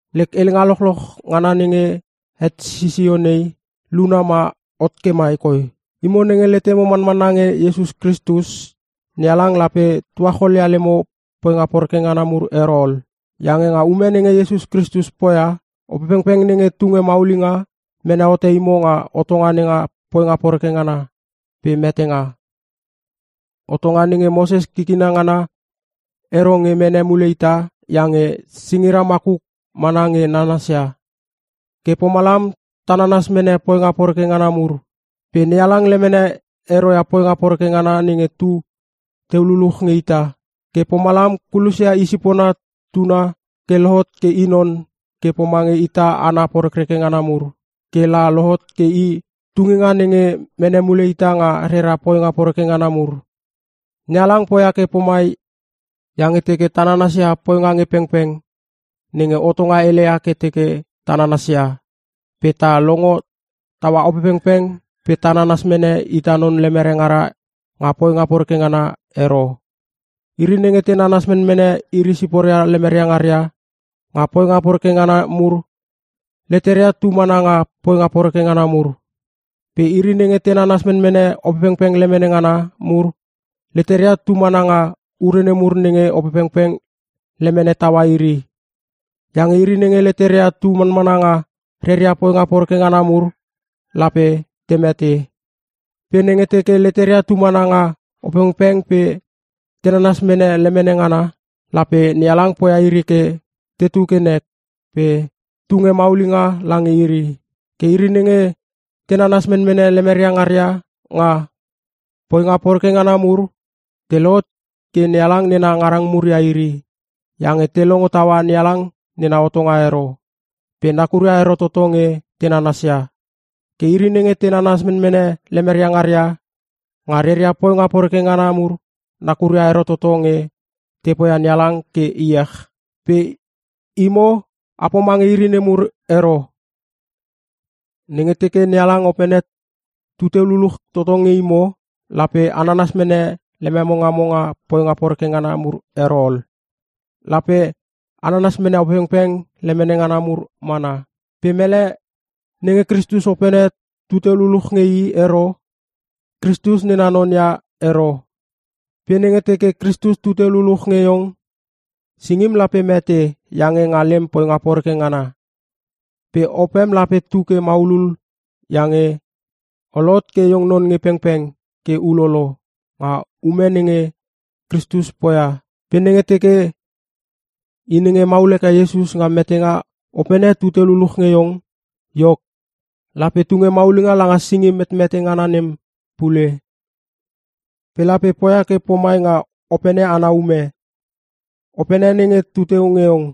Lek helenga lochloch ngana nenge het sisio nei, luna ma hot ke mai koi: Imo nenge letemo manmanna nge Iesus Kristus, NeHalang lape tuacholia lemo poinga poreke ngana mur ero ol. Iange nga ume nenge Iesus Kristus poia, Opepengpeng nenge tunge maulinga, mene hote imo nga hotonga nenga poinga poreke ngana pe metenga. Hotonga nenge Moses kikina ngana ero nge mene mule ita iange singira makuk mana nge nanasia. Ke pomalam ta nanas mene poinga poreke ngana mur. Pe NeHalang lemene ero ia poinga poreke ngana nenge tu teu luluch nge ita, ke pomalam kulosia i sipona Tuna ke lohot ke i non ke pomange ita hana porekreke ngana mur, ke la lohot ke I tunginga nenge mene mule ita nga rera poinga poreke ngana mur. NeHalang poia ke pomai iange teke ta nanasia poinga nge pengpeng nenge hotonga heleia ke teke ta nanasia pe ta longo taua Opepengpeng pe ta nanas mene ita non lemere ngara nga poinga poreke ngana ero. Iri nenge te nanas menmene iri siporia lemeria ngaria nga poinga poreke ngana mur, leteria tu mana nga poinga poreke ngana mur. Pe iri nenge te nanas menmene Opepengpeng lemene ngana mur, leteria tu mana nga ure nemur nenge Opepengpeng lemene taua iri. Iange iri nenge leteria tu manmana nga reria poinga poreke ngana mur, lape te mete. Pe nenge teke leteria tu mana nga Opepengpeng pe te nanas mene lemene ngana, lape NeHalang poia iri ke tetu ke nek pe tunge maulinga lange iri. Ke iri nenge te nanas menmene lemeria ngaria nga poinga poreke ngana mur, te lohot ke NeHalang nena ngarang mur ia iri iange te longo taua NeHalang nena hotonga ero pe nakuria ero toto nge te nanasia. Ke iri nenge te nanas menmene lemeria ngaria nga reria poinga poreke ngana mur nakuria ero toto nge te poia NeHalang ke iech. Pe imo a pomange iri nemur ero. Nenge teke NeHalang Opene tu teu luluch toto nge imo lape a nanas mene lememo ngamo nga poinga poreke ngana mur ero ol. Lape a nanas mene Opepengpeng lemene ngana mur mana. Pe mele nenge Kristus Opene tu teu luluch nge i ero, Kristus nena non ia ero. Pe nenge teke Kristus tu teu luluch nge iong, singim lape mete iange nga lem poinga poreke ngana. Pe opem lape tu ke maulul iange o lohot ke iong non nge pengpeng ke ulolo nga ume nenge Kristus poia. Pe nenge teke i nenge hemaul heke Iesus nga metenga Opene tu teu luluch nge iong, iok, lape tunge maulinga langa singim metmete ngana nem pule. Pe lape poia ke pomai nga Opene ana ume, Opene nenge tu teu nge iong.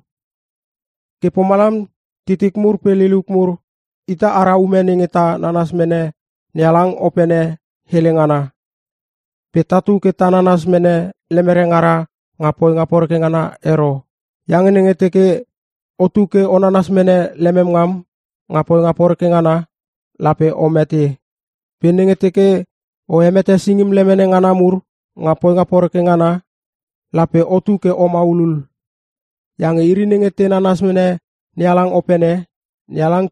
Ke pomalam titik mur pe liliuk mur, ita ara ume nenge ta nanas mene NeHalang Opene hele ngana. Pe tatu ke ta nanas mene lemere ngara nga poinga poreke ngana ero. Iange nenge teke otu ke o nanas mene lemem ngam nga poinga poreke ngana, lape o mete. Pe nenge teke o hemete singim lemene ngana mur nga poinga poreke ngana, lape otu ke o maulul. Iange iri nenge te nanas mene NeHalang Opene, NeHalang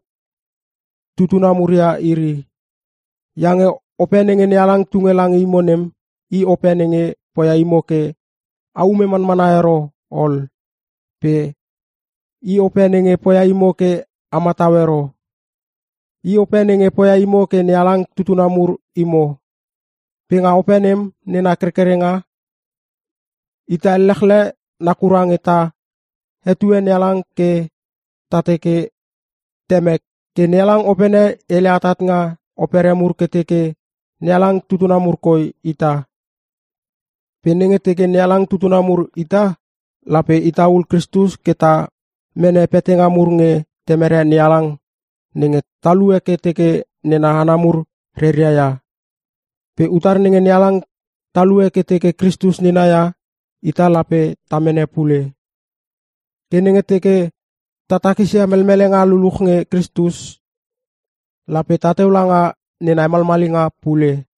tutuna mur ia iri. Iange Ope nenge NeHalang tunge lange imo nem, i Ope nenge poia imo ke a ume manmana ero ol pe i Ope nenge poia imo ke a matau ero. I Ope nenge poia imo ke NeHalang tutuna mur imo. Pe nga Ope nem nena kerkerenga, ita ellechle nakura nge ta hetue NeHalang ke ta teke, “Temek!” Ke NeHalang Opene hele atat nga opere mur ke teke NeHalang tutuna mur koi ita. Pe nenge teke NeHalang tutuna mur ita, lape ita ul Kristus ke ta mene petanga mur nge Temere NeHalang nenge talue ke teke nena hana mur reria ia. Pe utar nenge NeHalang talue ke teke Kristus nena ia, ita lape ta mene pule. Ke nenge teke ta takisia melmelenga luluch nge Kristus, lape tateu langa nena hemalmalinga pule.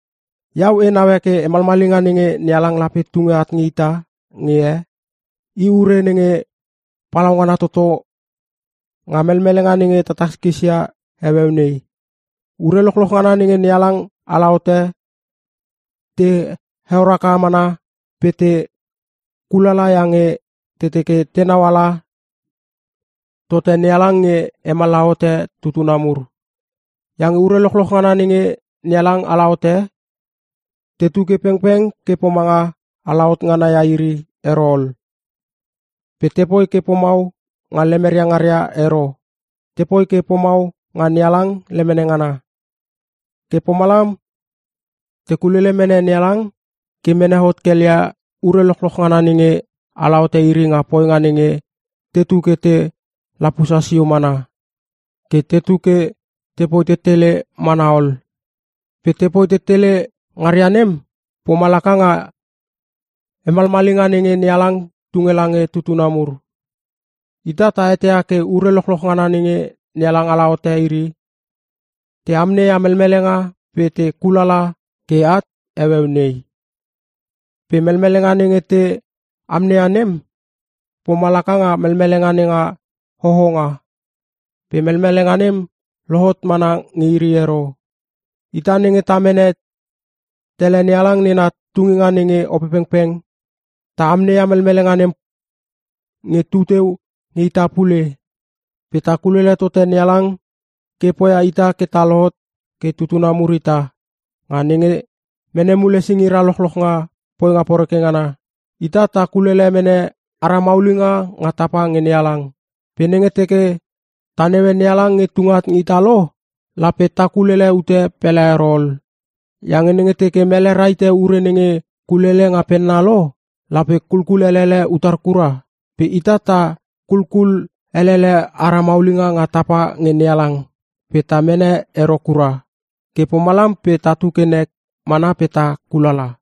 Iau e naue ke hemalmalinga nenge NeHalang lape tunge at nge ita nge he, i ure nenge palaungana toto nga melmelenga nenge ta takiskis ia heueu nei. Ure lochloch ngana nenge NeHalang ala hote te heor haka mana pe te kulala iange te teke tenau ala tote NeHalang nge hemallaha hote tutuna mur. Iange ure lochloch ngana nenge NeHalang ala hote, tetu ke pengpeng ke pomanga alahot ngana ia iri ero ol. Pe tepoi ke pomau nga lemeria ngaria ero – tepoi ke pomau nga NeHalang lemene ngana. Ke pomalam te kulele mene NeHalang ke mene hot kel ia ure lochloch ngana nenge ala hote iri nga poinga nenge tetu ke te lapusa sio mana, ke tetu ke tepoi tetele mana ol. Pe te poi tetele ngaria nem, pomalaka nga hemalmalinga nenge NeHalang tunge lange tutuna mur. Ita ta eteia ke ure lochloch ngana nenge NeHalang ala hote iri, te amneia melmelenga pe te kulalala ke at heueu nei. Pe melmelenga nenge te amneia nem pomalaka nga melmelenga nenga hohonga. Pe melmelenga nem lohot mana nge iri ero. Ita nenge ta mene tele NeHalang nena tunginga nenga Opepengpeng, ta amneia melmelenga nem nge tu teu nge ita pule. Pe ta kulele tote NeHalang ke poia ita ke ta lohot ke tutuna mur ita, nga nenge mene mule singira lochloch nga poinga poreke ngana. Ita ta kulkulele mene ara maulinga nga tapa nge NeHalang. Pe nenge teke ta naue NeHalang nge tunge at nge ita lo, lape ta kulele ute pele ero ol. Iange nenge teke mele rahite ure nenge kulelele nga penna lo, lape kulkulelele utar kura? Pe ita ta kulkulele ara maulinga nga tapa nge NeHalang pe ta mene ero kura, ke pomalam pe tatu ke nek mana pe ta kulala.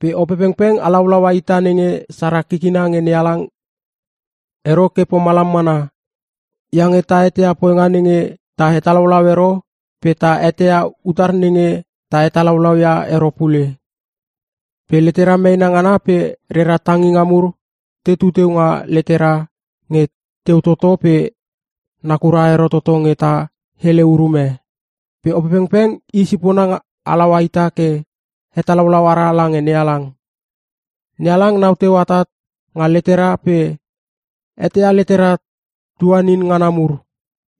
Pe Opepengpeng halaulaua ita nenge sara kikina nge NeHalang ero ke pomalam mana, iange ta eteia poinga nenge ta hetalaulau ero pe ta eteia utar nenge ta hetalaulau ia ero pule. Pe letera meena ngana pe rera tanginga mur tetu teu nga letera nge teu toto pe nakura ero toto nge ta hele urume. Pe Opepengpeng i sipona halaua ita ke hetalaulau ara lange NeHalang. NeHalang nau teu atat nga letera pe eteia letera tuanin ngana mur.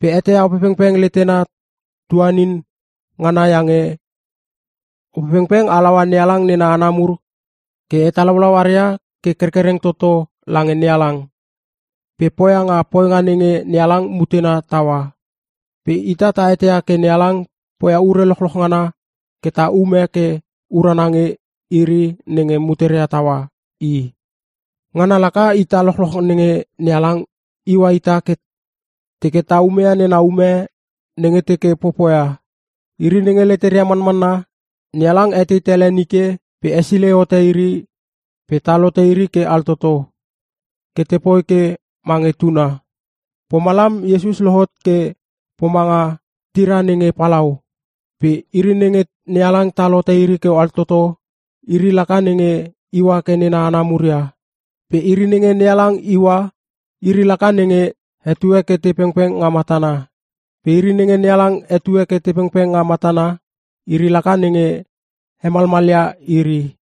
Pe eteia Opepengpeng letena tuanin ngana iange Opepengpeng halaua NeHalang nena hana mur ke hetalaulau aria ke kerkereng toto lange NeHalang, pe poia nga poinga nenge NeHalang mutena taua. Pe ita ta eteia ke NeHalang poia ure lochloch ngana ke te ume ke urana nge iri nenge muteria taua I. Ngana laka ita lochloch nenge NeHalang iua ita ke teke ta umeia nena ume nenge teke popoia. Iri nenge leteria manmanna, NeHalang etei tele nike pe hesilei hote iri pe tal hote iri ke altoto, ke tepoi ke mange Tuna. Pomalam Iesus lohot ke pomanga tiria nenge palau. Pe iri nenge NeHalang tal hote ke altoto, iri laka nenge iua ke nena hana mur ia. Pe iri nenge NeHalang iua, iri laka nenge hetue ke te pengpeng nga matana. Pe iri nenge NeHalang hetue ke te pengpeng nga matana, iri laka nenge hemalmalia iri.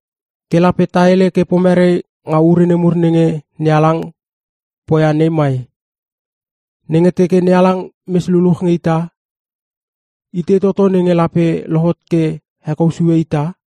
Ke lape ta hele ke pomerei nga ure nemur nenge NeHalang poia nei mai? Nenge teke NeHalang mes luluch nge ita, itei toto nenge lape lohot ke hekou sue ita?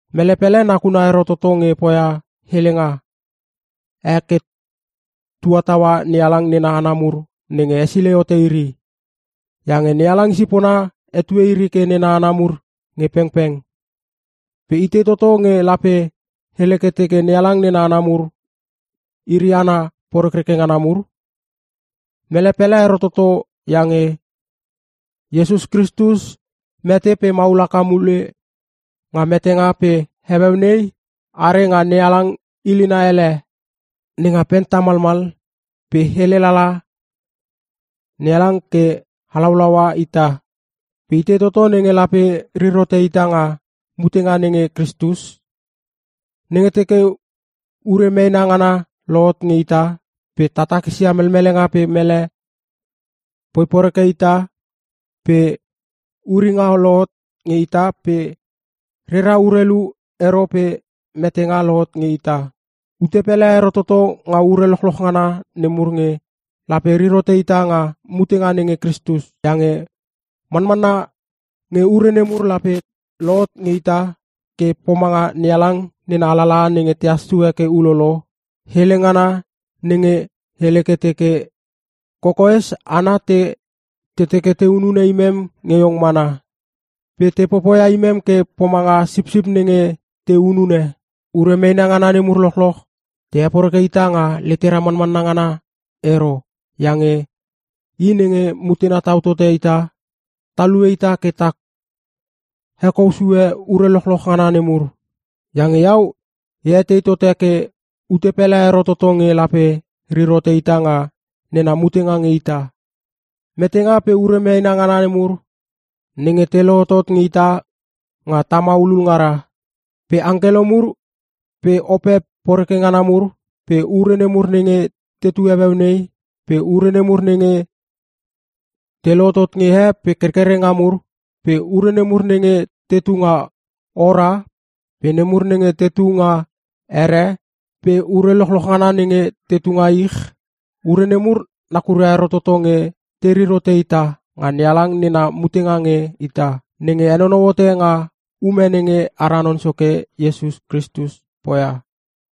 Mele pele nakuna ero toto nge poia helenga e ke tua taua NeHalang nena hana mur nenge hesilei hote iri. Iange NeHalang i sipona hetue iri ke nena hana mur nge pengpeng. Pe itei toto nge lape hele ke teke NeHalang nena hana mur iri hana porekreke ngana mur? Mele pele ero toto iange Iesus Kristus mete pe maul haka mule nga metenga pe heueu nei are nga NeHalang ilina ele nenga pen tamalmal pe hele lala nge NeHalang ke halaulaua ita. Pe itei toto nenge lape rir hote ita nga mutenga nenge Kristus? Nenge teke ure meena ngana lohot nge ita pe ta takisia melmelenga pe mele poi poreke ita, pe uringa lohot nge ita pe rera urelu ero pe metenga lohot nge ita. Ute pele ero toto nga ure lochloch ngana nemur nge lape rir hote ita nga mutenga nenge Kristus! Iange manmanna nge ure nemur lape lohot nge ita ke pomanga NeHalang nena alalaha nenge tehas sue ke ulolo, hele ngana nenge hele ke teke, “Kokoes hana te teke te hunune imem nge iong mana; Pe te popoia imem ke pomanga sipsip nenge te hunune.” Ure meena ngana nemur lochloch te heporeke ita nga letera manmanna ngana ero iange i nenge mutena tau tote ita, talue ita ke ta hekou sue ure lochloch ngana nemur. Iange iau e etei tote ke ute pele ero toto nge lape rir hote ita nga nena mutenga nge ita. Metenga pe ure meena ngana mur nenge te lohotot nge ita nga ta maulul ngara. Pe angkelo mur pe ope poreke ngana mur pe ure nemur nenge tetu heueu nei pe ure nemur nenge te lohotot nge he pe kerkerenga mur, pe ure nemur nenge tetu nga ora pe nemur nenge tetu nga ere pe ure lochloch ngana nenge tetu nga ich, ure nemur nakuria ero toto nge te rir hote ita nga NeHalang nena mutenga nge ita, nenge henonou hote nga ume nenge ara Non Soke Iesus Kristus poia.